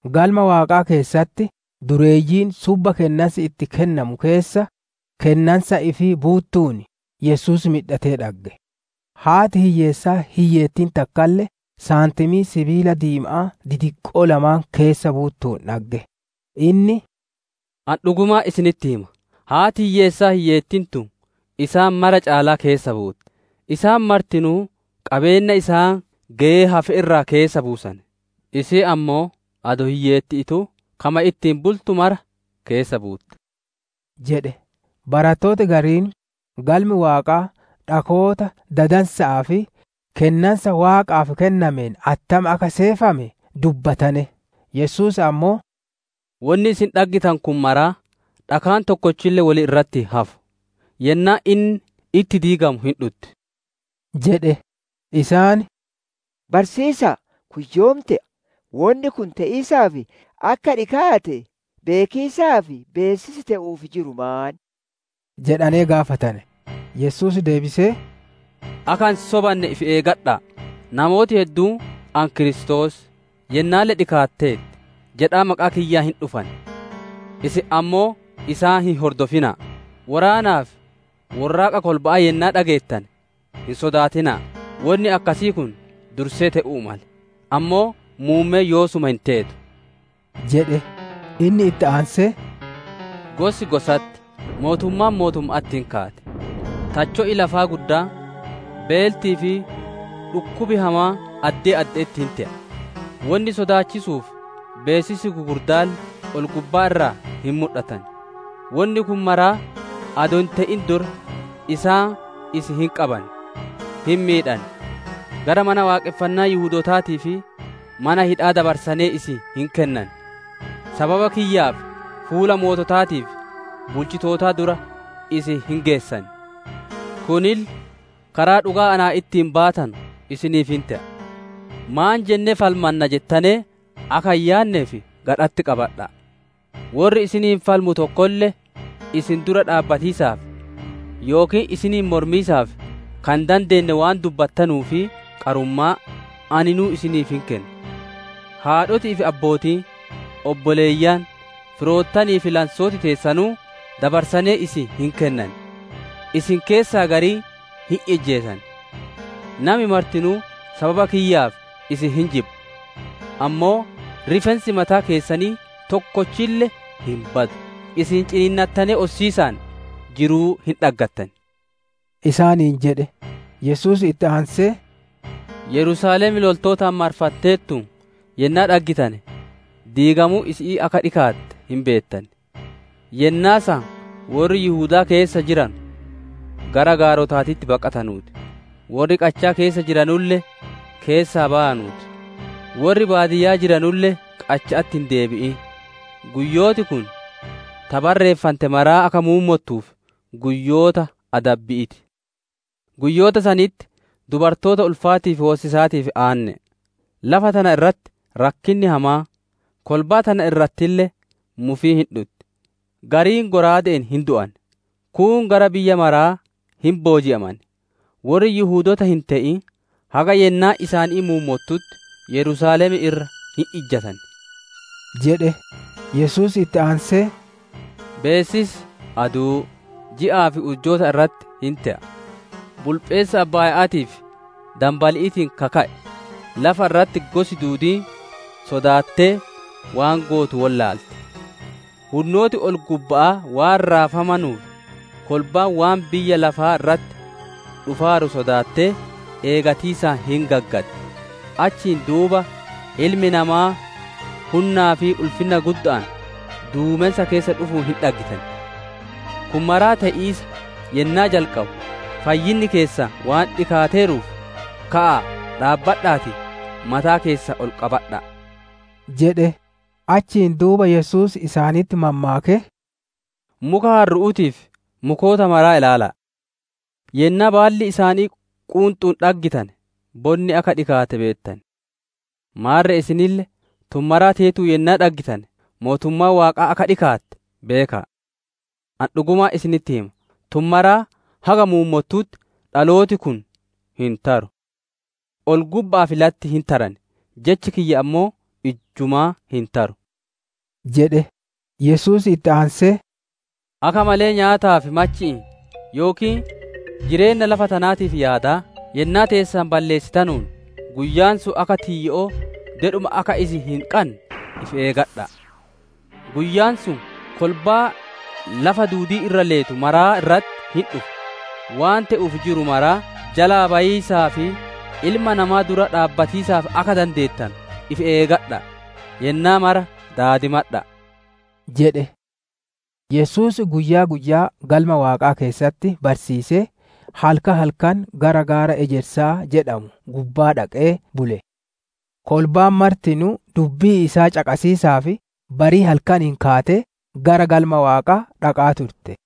Galma Waaqaa keessatti dureeyyiin subba kennansi itti kuufamu keessa, kennansa ifii buuttuun, Yesuus midhatee dhagge. Haati hiyyeessaa hiyyeettiin takkalle saantimii sibiila diima'aa didiqqoo lamaan keessa buuttuun dhagge. Inni, «Ani dhugumaan isinitti hima, haati hiyyeessaa hiyyeettiin tun isaan mara caalaa keessa buutte. Isaan martinuu qabeenna isaan geyee hafe irraa keessa buusane; isiin ammoo adoo hiyyeetti'iituu, kama ittiin bultu maraa keessa buutte» jedhe. Barattooti gariin Galmi Waaqaa dhakoota dadansa'aa fi kennansa Waaqaaf kennameen attam akka seefame dubbatane. Yesuus ammoo, «Wonni isin dhaggitanu kun maraa, dhakaan tokkolle wol irratti hin hafu; yennaan inni itti diigamu hin dhutti» jedhe. Isaan, «Barsiisaa, kun yoom te'a? Wonni kun te'iisaaf akka dhikaate beekiisaaf beessisi te'uuf jiru maan?» jedhanee gaafatane. Yesuus deebisee, «Akka hin sobanne ifi eeggadha'a! Namooti hedduun, ‹Ani Kiristoos, Yennaalle dhikaateerti!› jedhaa maqaa kiyyaan hin dhufan. Isin ammoo isaan hin hordofina'a! Woraanaa fi worraaqa kolba'aa yennaa dhageettane hin sodaatina'a! Wonni akkasii kun dursee te'uu male; ammoo muummeen yoosuma hin teetu» jedhe. Inni itti aansee, «Gosi gosatti, mootummaan mootumma'atti hin kaati; tacho'i lafaa guddaan, beeltii fi dhukkubi hamaan addee adde'etti hin te'an; wonni sodaachisuu fi beessisi gugurdaalle ol-gubbaa irraa hin mudhatan. Wonni kun maraa adoo hin te'in dura, isaan isin hin qaban, hin miidhan; gara mana waaqonfannaa Yihudootaatii fi mana hidha'aa dabarsanee isin hin kennan; sababa kiyyaaf fuula moototaatii fi bulchitootaa dura isin hin geessan. Kunille karaa dhugaa naa ittiin baatanu isiniif hin te'a. ‹Maan jennee falmanna› jettanee akka hin yaanneef gadha'atti qabadha'a! Worri isiniin falmu tokkolle, isin dura dhaabbatiisaaf, yookiin isiniin mormiisaaf ka hin dandeenne, waan dubbattanuu fi qarummaa, aninuu isiniif hin kenna. Haadhoti'ii fi abbootiin, obboleeyyan, firoottanii fi lansooti teessanuu dabarsanee isin hin kennan; isin keessaa garii hin ijjeesan. Nami martinuu sababa kiyyaaf isin hin jibba. Ammoo rifeensi mataa keessanii tokkolle hin badu. Isin ciniinnattanee ossatiisaan jiruu hin dhaggattan» isaaniin jedhe. Yesuus itti aansee, «Yerusaalem loltootaan marfanteertuun yennaa dhaggitane diigamuun isi'ii akka dhikaate hin beettan. Yennaa san worri Yihudaa keessa jiranu gara gaarotaatitti baqatanuu ti; worri qachaa keessa jiranulle keessaa bayanuu ti, worri baadiyyaa jiranulle qacha'atti hin deebi'in. Guyyooti kun, ta barreeffante maraa akka muummottuuf, guyyoota adabbi'ii ti. Guyyoota sanitti dubartoota ulfaatii fi hoosisaatiif aanne'e! Lafa tana irratti rakkinni hamaan, kolbaa tana irrattille mufiin hin dhutti. Gariin shallaaga'aan hin du'an, kuun gara biyya maraa hin booji'aman. Worri Yihudoota hin te'in haga yennaan isaanii muummottutti, Yerusaalem irra hin ejjatan» jedhe. Yesuus itti aansee, «Beessisi aduu, ji'aa fi urjoota irratti hin te'a. Bulpheessa abbaaya'aatii fi danbali'iitiin ka ka'e lafa irratti gosi duudiin sodaattee, waan gootu wollaalti. Hunnooti ol-gubba'aa waan raafamanuuf, kolbaan waan biyya lafaa irratti dhufaaru sodaattee eegatiisaan hin gaggaddi. Achiin duuba Ilmi Namaa hunnaa fi ulfinna gudda'aan duumensa keessa dhufuun hin dhaggan. Kun maraa te'iisa yennaa jalqabu, fayyinni keessan waan dhikaateeruuf, ka'aa dhaabbadha'aatii mataa keessan ol qabadha'a» jedhe. Achiin duuba Yesuus isaanitti mammaakee, «Muka harru'uutii fi mukoota maraa ilaala'a. Yennaa baalli isaanii quunxuun dhaggitane, bonni akka dhikaate beettan. Maarre isinille, tun maraa teetuun yennaa dhaggitane, mootummaan Waaqaa akka dhikaatte beeka'a. Ani dhugumaan isinitti hima, tun maraa haga muummottutti dhalooti kun hin taru. Ol-gubba'aa fi latti hin taran, Jechi kiyya ammoo ijjumaa hin taru» jedhe. Yesuus itti aansee, «Akka malee nyaataa fi machi'iin yookiin jireenna lafa tanaatiif yaadaa, yennaa teessan balleessitanuun, guyyaan sun akka tiyyo'oo dedhuma akka isin hin qanne ifi eegadha'a! Guyyaan sun kolbaa lafa duudii irra leetu maraa irratti hin dhufa. Waan te'uuf jiru maraa jalaa bayiisaa fi Ilma Namaa dura dhaabbatiisaaf akka dandeettanu, ifi eegadha'aa, yennaa mara daadimadha'a!» jedhe. Yesuus guyyaa guyyaa Galma Waaqaa keessatti barsiisee, halkan halkan gara gaara ejersaa jedhamu gubbaa dhaqee bule. Kolbaan martinuu dubbii isaa caqasiisaaf barii halkaniin kaatee gara Galma Waaqaa dhaqaa turte.